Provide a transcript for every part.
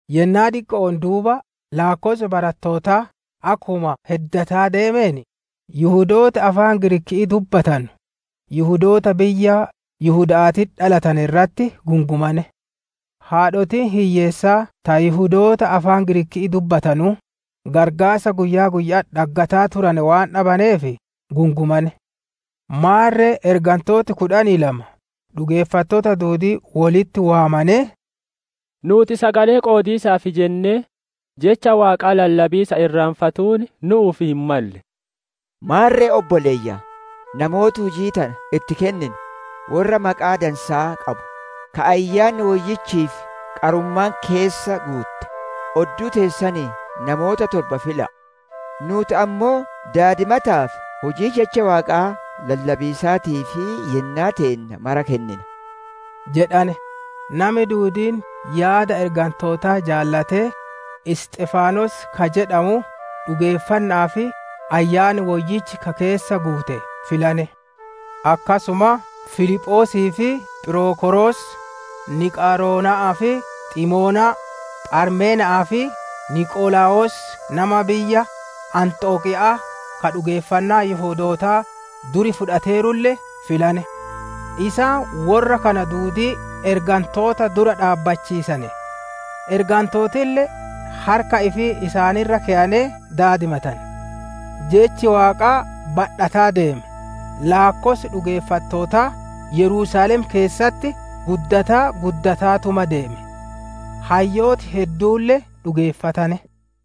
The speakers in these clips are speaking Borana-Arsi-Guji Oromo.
Yennaa diqqo'oon duuba laakkossi barattootaa akkuma heddataa deemeen, Yihudooti afaan Giriikii dubbatanu Yihudoota biyya Yihuda'aatitti dhalatane irratti gungumane; haadhotiin hiyyeessaa ta Yihudoota afaan Giriikii dubbatanuu, qarqaarsa guyyaa guyya'atti dhaggataa turane waan dagatamaneef gungumane. Maarre ergantooti kudhanii lama dhugeeffattoota duudii wolitti waamanee, «Nuuti sagalee qoodiisaaf jennee Jecha Waaqaa lallabiisa irraanfatuun nu'uuf hin malle. Maarre obboleeyyan, namoota hujii tana itti kenninu, worra maqaa dansaa qabu, ka Ayyaanni Woyyichii fi qarummaan keessa guutte, odduu teessanii namoota torba fila'a. Nuuti ammoo daadimataa fi hujii Jecha Waaqaa lallabiisaatiif yennaa teenna mara kennina» jedhane. Nami duudiin yaada ergantootaa jaalatee, Isxifaanos ka jedhamu dhugeeffanna'aa fi Ayyaanni Woyyichi ka keessa guute filane; akkasuma Filiphoosii fi Phirokoros, Niqaaroona'aa fi Ximoonaa, Pharmena'aa fi Niqolaawosii nama biyya Anxokiya'aa ka dhugeeffannaa Yihudootaa dur fudhateerulle filane. Isaan worra kana duudii ergantoota dura dhaabbachiisane; ergantootille harka ifi isaan irra keyanee daadimatane. Jechi Waaqaa badhataa deeme, laakkossi dhugeeffattootaa Yerusaalem keessatti guddataa guddataatuma deeme; hayyooti hedduulle dhugeeffatane.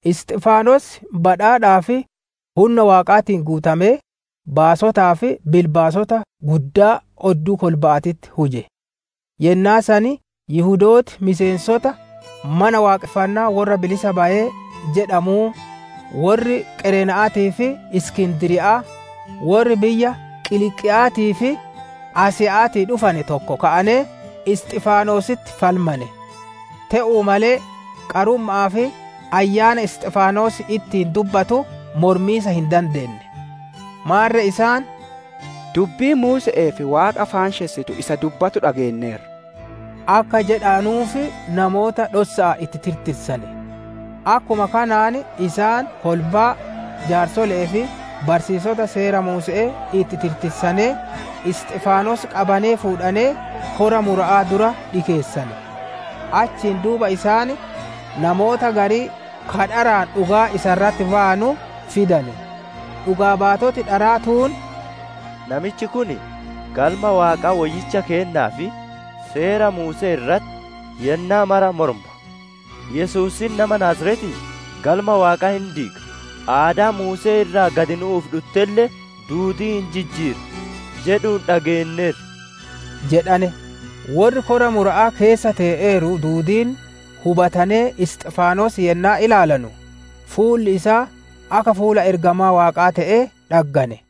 Isxifaanos badhaadhaa fi hunna Waaqaatiin guutamee baasotaa fi bilbaasota guddaa odduu kolba'aatitti huje. Yennaa san Yihudooti miseensota, «Mana waaqonfannaa worra bilisa bayee» jedhamuu, worri Qareena'aatii fi Iskindiriya'aa, worri biyya Qiliiqiya'aatii fi Asiya'aatii dhufane tokko ka'anee Isxifaanositti falmane. Te'uu malee, qarumma'aa fi Ayyaana Isxifaanos ittiin dubbatu mormiisa hin dandeenne. Maarre isaan, «Dubbii Muuse'ee fi Waaqa faanshessitu isaa dubbatu dhageenneerra» akka jedhanuuf namoota dhossa'aan itti tirtirsane. Akkuma kanaan isaan kolbaa, jaarsole'ee fi barsiisota Seera Muuse'ee itti tirtisanee, Isxifaanos qabanee fuudhanee kora mura'aa dura dhikeessane. Achiin duuba isaan namoota garii ka dharaan dhugaa isa irratti bayanu fidane. Dhugaa baatoti dharaa tuun, «Namichi kun, Galma Waaqaa woyyicha keennaa fi Seera Muuse'ee irratti yennaa mara morma. ‹Yesuusiin nama Naaziretii Galma Waaqaa hin diiga, aadaa Muusee irraa gad nu'uuf dhuttelle duudii hin jijjiira› jedhuun dhageenneerra» jedhane. Worri Kora mura'aa keessa tee'eeru duudiin hubatanee Isxifaanos yennaa ilaalanu, fuulli isaa akka fuula ergamaa Waaqaa te'ee dhaggane.